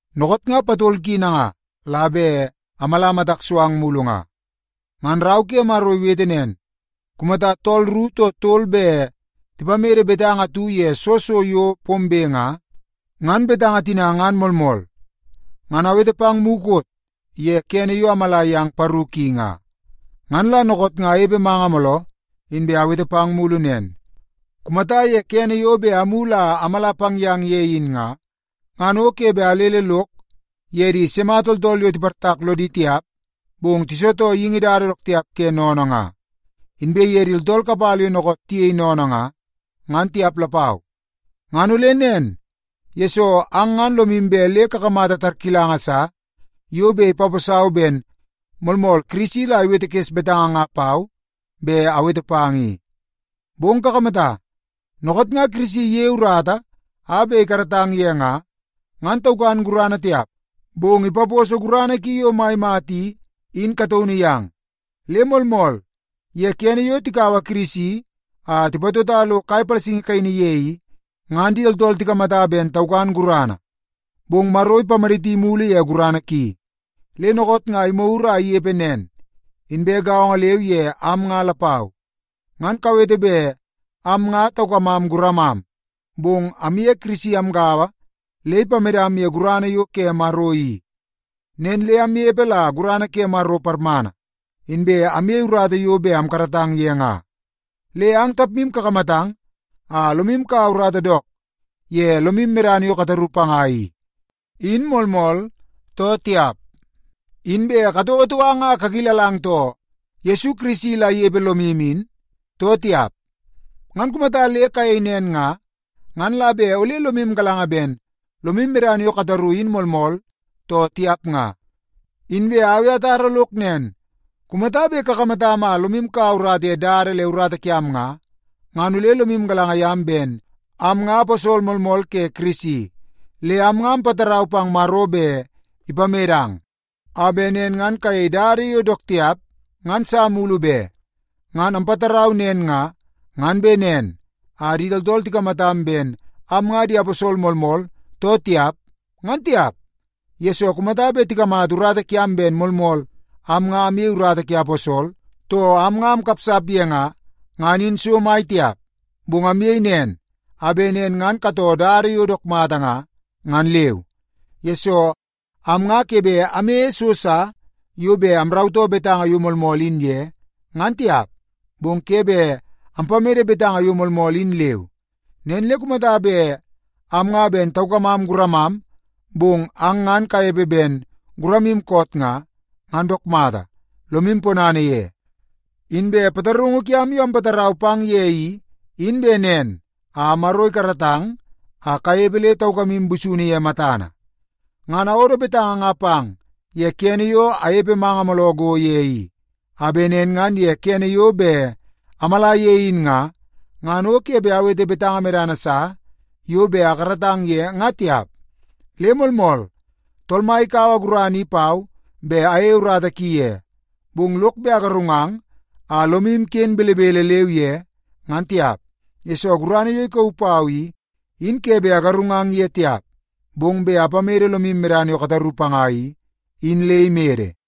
Dookoot nga patol ki nanga la bet amala matak so ang mulu nga. Ngan rau ke Maro iwete nen, “Kumata tool ru too tol bet tipamede betanga atu ye soo so yo pombe nga, ngan betanga tina ngan moolmool.” Ngan awete pang mukot ye kene yo amala yang paru ki nga. Ngan la dookoot nga anepe manga mooloo, inbe awete pang mulu nen. Kumata ye kene yo bet amulu a amala pang yang ye in nga, ngan o ke bet alele lok ye di sima tooltool yo tiportak lodi tiap bong tisitoo geingi dada dook tiap ke sennene nga, inbe ye di tooltool kapala yo dookoot tiyei sennene nga, ngan tiap lapau. Ngan ole nen, yesoo ang ngan lomu bet le kakamata tarkilanga sa yo bet ipaposau ben moolmool Kirisi la iwetekes betanga nga pau bet awete pang i. Bong kakamata, dookoot nga Kirisi iyei urata a bet ikaratang ye nga, ngan taukan gurana tiap, bong ipaposo gurana ki yo mai mata i, in kataunu yang. Le moolmool, ye kene yo tikaua Kirisi a tipatota lo kai palasingi kaini ye i, ngan di tooltool tikamata ben taukan gurana, bong Maro ipamaditi mulu ye gurana ki, le dookoot nga imagur a inepe nen. Inbe gaongo leu ye am nga lapau. Ngan kawete bet am nga taukamam guramam, bong amye Kirisi amgaua le ipamedam ye gurana yo ke Maro i. Nen le amnepe la gurana ke Maro parmana, inbe amyei urata yo bet amkaratang ye nga. Le ang tapmu kakamatang a lomu kaua urata dook ye lomu medana yo kataru panga i, in moolmool, too tiap? Inbe katouotou ang a kakilalang too, Yesu Kirisi la inepe lomu in, too tiap? Ngan kumata le kayei nen nga, ngan la bet ole lomu galanga ben lomu medana yo kataru in moolmool, too tiap nga. Inbe au i atara lok nen, kumata bet kakamatam a lomu kaua urata ye dada le urata kiam nga, ngan ole lomu galanga yam ben am nga aposol moolmool ke Kirisi. Le am nga ampatarau pang Maro bet ipamedang, a bet nen ngan kayei dada yo dook tiap ngan sa mulu be. Ngan ampatarau nen nga, ngan bet nen a di tooltool tikamatam ben am nga di aposol moolmool too tiap, ngan tiap, yesoo kumata bet tikamata urata kiam ben moolmool am nga amyei urata ke aposol, too am nga amkapsap ye nga, ngan in so mai tiap. Bong amyei nen, a bet nen ngan katoo dada yo dook mata nga, ngan leu. Yesoo, am nga ke bet amyeie so sa yo bet amrautoo betanga yo moolmool in ye, ngan tiap. Bong ke bet ampamede betanga yo moolmool in leu. Nen le kumata bet am nga ben taukamam guramam, bong ang ngan kanepe dook ben guramu koot nga, ngan dook mata, lomam ponana ye. Inbe pataraungu kiam yo ampatarau pang ye i, in bet nen a Maro ikaratang a kanepe le taukamu busunu ye matana. Ngan awodo betanga nga pang ye kene yo anepe manga mooloo go ye i, a bet nen ngan ye kene yo bet amala ye in nga, ngan o ke bet awete betanga medana sa yo bet akaratang ye nga tiap. Le moolmool, Tool Mai ikaua gurana i pau bet ayei urata ki ye, bong lok bet agarungang a lomu ken belebele leu ye, ngan tiap. Yesoo, gurana yo ikauu pau i, in ke bet agarungang ye tiap, bong bet apamede lomu medana yo kataru panga i, in le imede.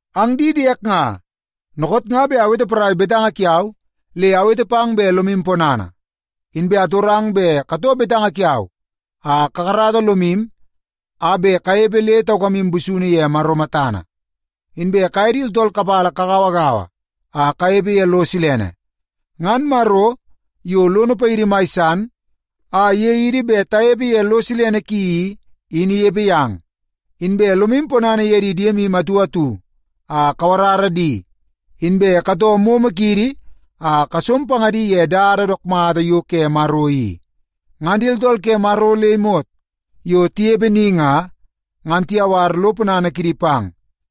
Ang di diek nga, dookoot nga bet awete porai betanga kiau, le awete pang bet lomu ponana. Inbe atorang bet katoo betanga kiau a kakarata lomu a bet kanepe le taukamu busunu ye Maro matana. Inbe kaye di tooltool kapala kagauagaua a kanepe ye lo silene. Ngan Maro, yo lono paidi mai san a iyei idi bet tanepe ye lo silene ki i, in inepe yang. Inbe lomu ponana ye di diemu atu atu a kawarara di, inbe katoo momo kiidi a kasom pangadi ye dada dook mata yo ke Maro i. Ngan di tooltool ke Maro le imot yo tinepe ni nga, ngan tiyawar lo ponana kidi pang.